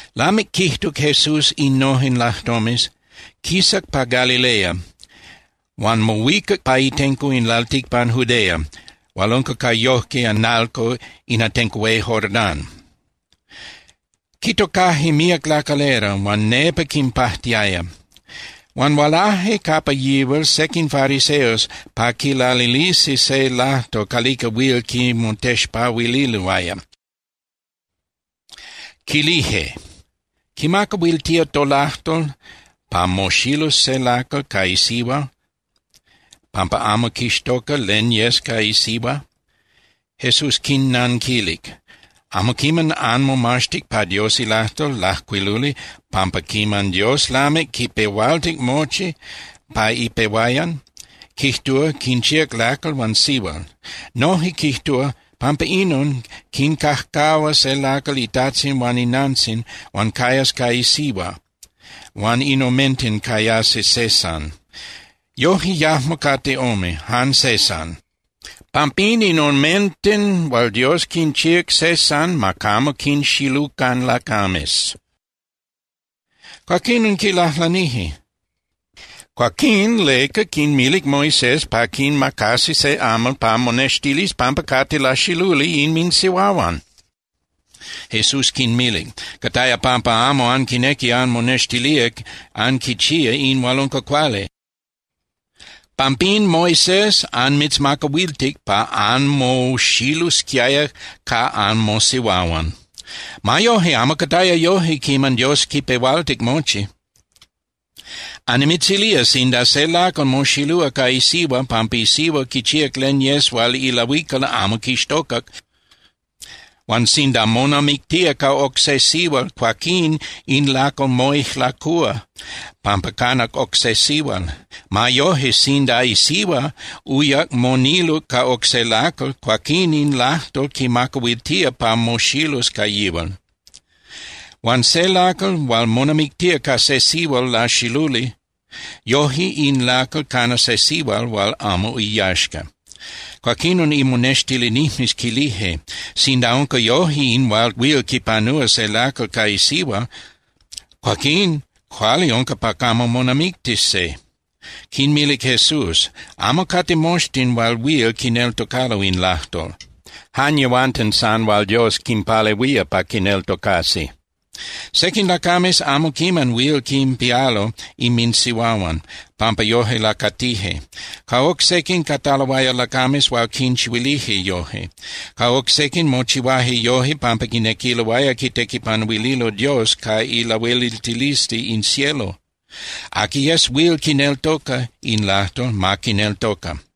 Lamic quijtuc Jesús innojen lajtomes, quisac pa Galilea huan mohuicac pa itenco in lalticpan Judea hual unca ca yojque (analco) in atenco hué Jordán. Quitocaje míac lacalera huan nepa quinpajtiaya. Huan hualaje capa yihual sequin fariseos pa quilalilisi se lajtol calica huil quimotexpahuililoaya, quilije: —¿Quimacahuiltía tolajtol pa moxilus se lacal ca isihua pampa amo quixtoca len yes ca isihua? Jesús quinnanquilic: —¿Amo quiman anmomaxtic pa Dios ilajtol lajcuiluli pampa quiman Dios lamic quipehualtic mochi (pa ipehuayan), quijtúa “quinchíac lacal huan sihual”? Noje quijtúa: “Pampa inon, quincajcahua se lacal itajtzin huan inantzin huan cayas ca isihua huan in omenten cayasi se san.” Yoje yajmo cate ome, jan se san. Pampín, in omenten hual Dios quinchíac se san ma camo quinxilucan lacames. Cuaquinon quilajlanije: —Cuaquín ¿leca quinmilic Moisés pa quinmacasi se amal pa monextilis pampa cate laxiluli inminsihuahuan? Jesús quinmilic: —Cataya pampa amo anquinequi anmonextilía anquichía in hual unca cuali. Pampín Moisés anmitzmacahuiltic pa anmoxilusquiaya ca anmosihuahuan. Ma yoje amo cataya yoje quiman Dios quipehualtic mochi. Annimitzilía sinda se lacal moxilúa ca isihua pampa isihua quichíac len yes hual ilahuical amo quixtocac, huan sinda monamictía ca oc se sihual, cuaquín in lacal moijlacúa pampa canac oc se sihual. Ma yoje, sinda isihua uyac moniluc ca oc se lacal, cuaquín in lajtol quimacahuiltía pa moxilus ca yihual. Huan se lacal hual monamictía ca se sihual laxiluli, yoje in lacal cana se sihual hual amo iyaxca. Cuaquinon imonextilinijmes quilije: —Sinda unca yoje in hual huil quipanúa se lacal ca isihua, cuaquín cuali unca pa camo monamictis se. Quinmilic Jesús: —Amo cate moxtin hual huil quineltocalo in lajtol, jan yehuanten san hual Dios quinpalehuía pa quineltocasi. Sequin lacames amo quiman huil quinpialo inminsihuahuan, pampa yoje lacatije. Ca oc sequin, cataloaya lacames hual quinchihuilije yoje. Ca oc sequin, mochihuaje yoje pampa quinequiloaya quitequipanuililo Dios ca ilahueliltilisli in cielo. Aqui yes huil quineltoca in lajtol, ma quineltoca.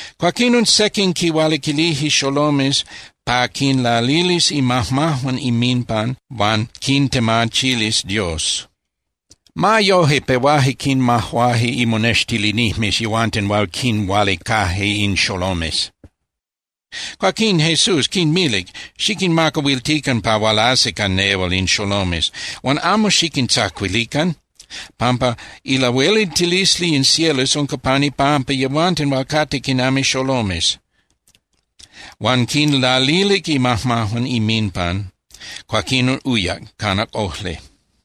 Cuaquinon sequin quihualiquilije xolomes pa quinlalilis imajmajuan inminpan huan quintemachilis Dios. Ma yoje, pehuaje quinmajuaje imonextilinijmes yehuanten hual quinhualicaje in xolomes. Cuaquín Jesús quinmilic: —Xiquinmacahuiltican pa hualasi ca nehual in xolomes huan amo xiquintzacuilican, pampa ilahueliltilisli in cielos unca pan ipampa yehuanten hual cate quinami xolomes. Huan quinlalilic imajmajuan inminpan, cuaquinon uyac, canac ojli.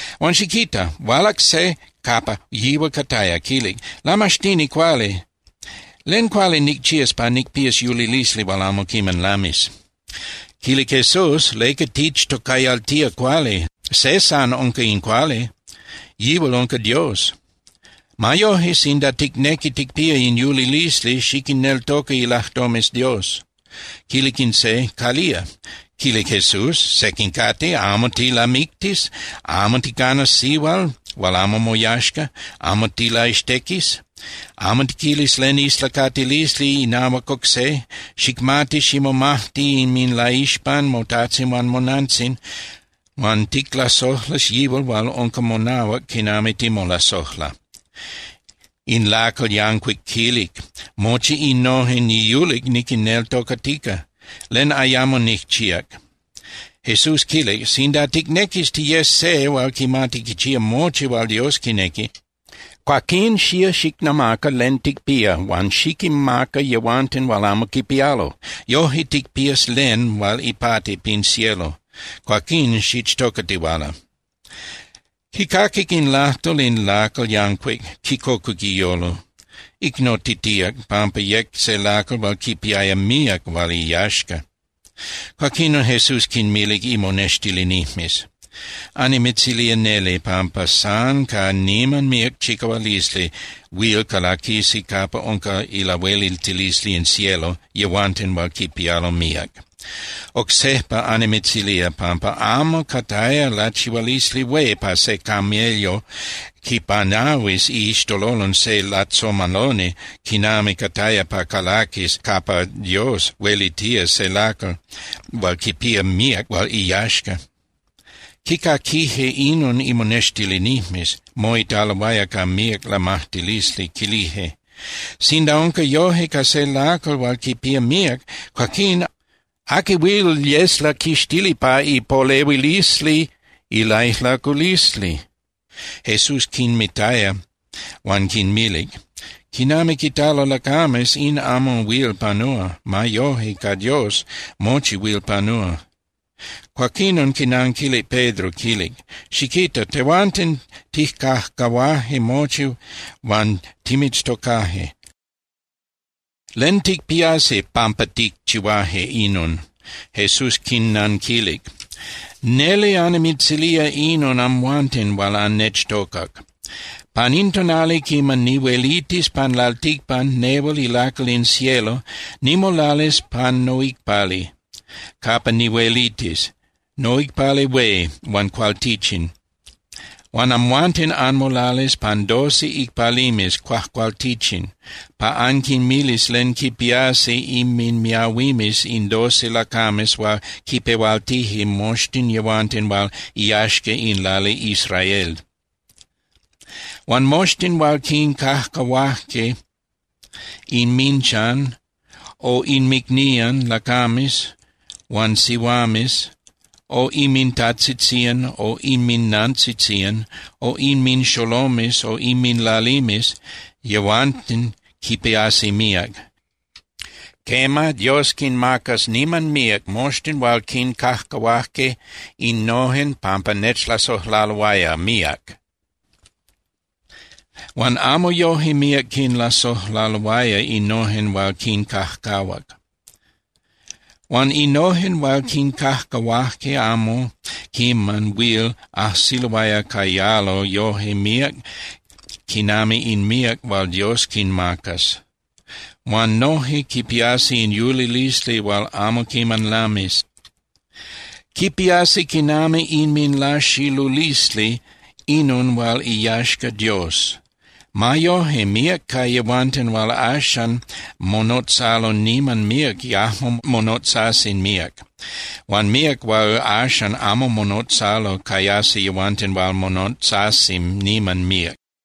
Huan xiquita, hualac se capa yihual cataya, quilic: —Lamaxtini cuali, ¿len cuali nicchías pa nicpías yulilisli hual amo quiman lamis? Quilic Jesús: —¿Leca tichtocayaltía cuali? Se san unca in cuali. Yihual unca Dios. Ma yoje, sinda ticnequi ticpía in yulilisli, xiquinneltoca ilajtomes Dios. Quilic in se: —¿Calía? Quilic Jesús: —Sequin cate: Amo tilamictis, amo ticanas sihual hual amo moyaxca, amo tilaxtequis. Amo tiquilis len islacatilisli inahuac oc se, xicmati ximomajti inminlaixpan motajtzin huan monantzin, huan ticlasojlas yihual hual unca monahuac quinami timolasojla. In lacal yancuic quilic: —Mochi innojen niyulic niquinneltocatica. ¿Len ayamo nicchíac? Jesús quilic: —Sinda ticnequis tiyes se hual quimati quichía mochi hual Dios quinequi, cuaquín xía xicnamaca len ticpía huan xiquinmaca yehuanten hual amo quipialo. Yoje ticpías len hual ipati pin cielo. Cuaquín xichtocatihuala. Quicaquic in lajtol in lacal yancuic, quicocuc iyolo. Icnotitíac, pampa yec se lacal hual quipiaya míac hual iyaxca. Cuaquinon Jesús quinmilic imonextilinijmes: —Annimitzilía neli pampa san ca niman míac chicahualisli huil calaquisi capa unca ilahueliltilisli in cielo yehuanten hual quipialo míac. Oc sejpa annimitzilía pampa amo cataya lachihualisli hué pa se camello quipanahuis iixtololon se lajtzomaloni quinami cataya pa calaquis capa Dios huelitía se lacal hual quipía míac hual iyaxca. Quicaquije inon imonextilinijmes, moitaloaya ca míac lamajtilisli, quilije: —Sinda unca yoje ca se lacal hual quipía míac, cuaquín ¿aqui huil yes laquixtili pa ipolehuilisli ilaijlaculisli? Jesús quinmitaya huan quinmilic: —Quinami quitalo lacames, in amo huil panúa. Ma yoje, ca Dios mochi huil panúa. Cuaquinon quinanquilic Pedro, quilic: —Xiquita. Tehuanten tijcajcahuaje mochi huan timitztocaje. ¿Len ticpiasi pampa ticchihuaje inon? Jesús quinnanquilic: —Neli annimitzilía inon amhuanten hual annechtocac. Pan in tonali quiman nihuelitis pan lalticpan nehual ilacal in cielo, nimolalis pan noicpali capa nihuelitis, noicpali hué huan cualtichin, huan amhuanten anmolalis pan doce icpalimes cuajcualtichin pa anquinmilis len quipiasi inminmiahuimes in doce lacames hual quipehualtije moxtin yehuanten hual iyaxca in lali Israel. Huan moxtin hual quincajcahuaje inminchan, o inmicnían lacames huan sihuames o inmintajtzitzían o inminantzitzían o inminxolomes o inminlalimes, yehuanten quipiasi míac. Quema, Dios quinmacas niman míac moxtin hual quincajcahuaje innojen pampa nechlasojlaloaya míac. Huan amo yoje míac quinlasojlaloaya innojen hual quincajcahuac. Huan innojen hual quincajcahuaje amo quiman huil ajsiloaya cayalo yoje míac quinami in míac hual Dios quinmacas. Huan noje quipiasi in yulilisli hual amo quiman lamis. Quipiasi quinami inminlaxilulisli inon hual iyaxca Dios. Ma yoje, míac ca yehuanten hual axan monotzalo niman míac yajmo monotzasi míac. Huan míac hual axan amo monotzalo cayasi yehuanten hual monotzasi niman míac.